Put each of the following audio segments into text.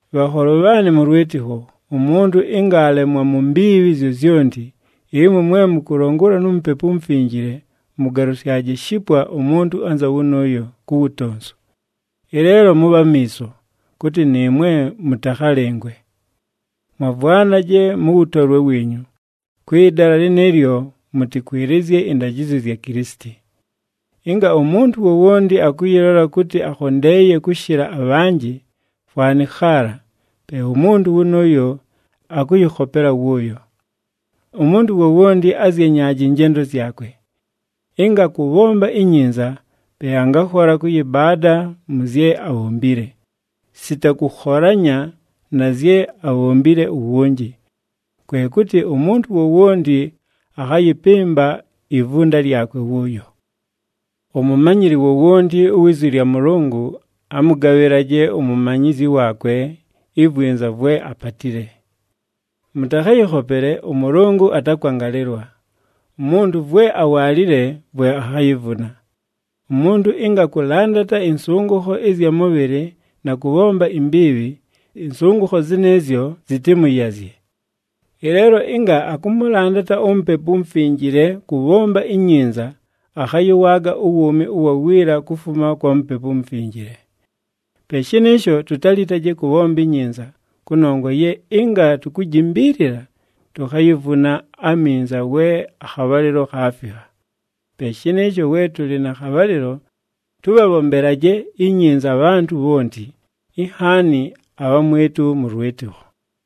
Bhanholo bhaanɨ mʉ lwɨtɨkho, umuntu ɨnga aalemwa mu mbiibhi zyozyonti, ɨmwe mwe mʉkʉlongolwa nu Mupepu uMufinjile mʉgalʉsyaje shipwa umuntu anza wʉnʉʉyo, ku wutonsu. Ɨleelo mʉbhe amiiso, kʉtɨ nɨɨmwe mʉtakhalɨngwe. Mwavwanaje mʉ wʉtolwe wiinyu, kwɨ dala lɨnɨɨlyo mʉtɨkwɨlɨzye ɨndajɨzyo zya Kilisiti. Ɨnga umuntu wowonti akʉyɨlola kʉtɨ akhondeeye kʉshɨla abhanjɨ, fwanɨ khaala, pe umuntu wʉnʉʉyo akʉyɨkhopela wʉʉyo. Umuntu wowonti azyenyaaje ɨnjendo zyakwe. Ɨnga akʉbhomba inyinza, pe angakhola kʉyɨbaada mʉ zye abhombile, sita kʉkholanya na zye abhombile uwunji. Kwe kʉtɨ umuntu wowonti akhayɨpɨmba ivunda lyakwe wʉʉyo. Umumanyili wowonti uwi zwi lya Mʉlʉngʉ, amʉgabhɨlaje umumanyizyi waakwe ivwinza vwe apatile. Mʉtakhayɨkhopele, ʉMʉlʉngʉ atakwangalɨlwa. Umuntu vwe awaalile, vwe akhayivuna. Umuntu ɨnga akʉlandata ɨnsʉngʉkho ɨzya mʉbhɨlɨ na kʉbhomba imbiibhi, ɨnsʉngʉkho zɨnɨɨzyo zɨtɨmʉyazye. Ɨleelo ɨnga akʉmʉlandata uMupepu uMufinjile kʉbhomba inyinza akhayɨwaaga uwuumi ʉwa wiila kufuma kwa Mupepu uMufinjile. Pe shɨnɨɨsho, tutalitaje kʉbhomba inyinza, kʉnongwa ye ɨnga tukujimbiilila, tukhayivuna aminza we akhabhalɨlo khaafikha. Pe shɨnɨɨsho we tʉlɨ na khabhalɨlo, tʉbhabhombelaje inyinza abhantʉ bhonti, inhaani abhamwɨtʉ mʉ lwɨtɨkho.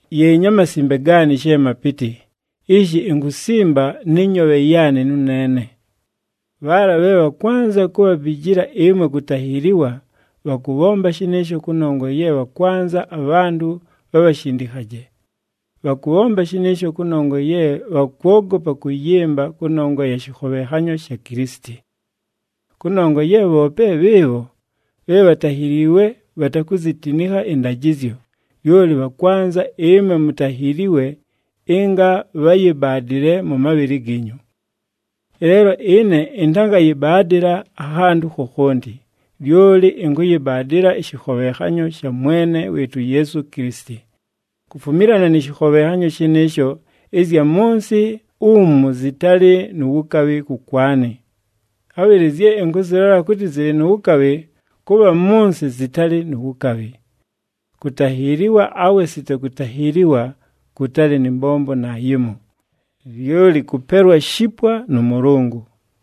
Yeenyi amasimbe gaanɨ she mapɨtɨ, ishi inkusimba nɨ nyoobhe yaanɨ nʉneene! Bhaala bhe bhakwanza kubhabijila ɨmwe kutahiiliwa, bhakʉbhomba shɨnɨɨsho kʉnongwa ye bhakwanza abhantʉ bhabhashindikhaje. Bhakʉbhomba shɨnɨɨsho kʉnongwa ye bhakwogopa kʉyɨmba kʉnongwa ya shɨkhobhenhanyo sha Kilisiti. Kʉnongwa ye bhoope bhɨɨbho bhe bhatahiliiwe bhatakuzitinikha ɨndajɨzyo, lyoli bhakwanza ɨmwe mutahiiliwe ɨnga bhayɨbaadɨle mʉ mabhɨlɨ giinyu. Ɨleelo ɨne ɨntangayɨbaadɨla akhantʉ khokhonti, lyoli ɨnkʉyɨbaadɨla ɨshɨkhobhenhanyo sha Mwene wɨɨtʉ uYeesu Kilisiti. Kufumilana nɨ shɨkhobhenhanyo shɨnɨɨsho, ɨzya mʉ nsɨ umu zɨtalɨ nu wukabhi kʉkwanɨ, khabhɨlɨ zye ɨnkʉzɨlola kʉtɨ zɨlɨ nu wukabhi, kʉ bha mʉ nsɨ zɨtalɨ nu wukabhi. Kutahiiliwa awe sita kutahiiliwa, kʉtalɨ nɨ mbombo naayimo, lyoli kʉpelwa shipwa nʉ Mʉlʉngʉ.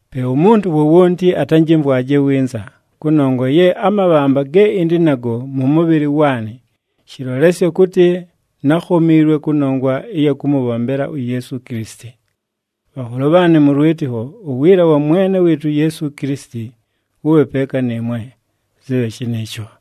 Pe umuntu wowonti atanjɨmvwaje winza, kʉnongwa ye amabhamba ge ɨndɨ nago mʉ mʉbhɨlɨ waanɨ, shɨlolesyo kʉtɨ nákhomiilwe kʉnongwa ɨya kʉmʉbhombela uYeesu Kilisiti. Bhanholo bhaanɨ mʉ lwɨtɨkho, uwiila wa Mwene wɨɨtʉ uYeesu Kilisiti wʉbhe peeka nɨɨmwe. Zɨbhe shɨnɨɨsho.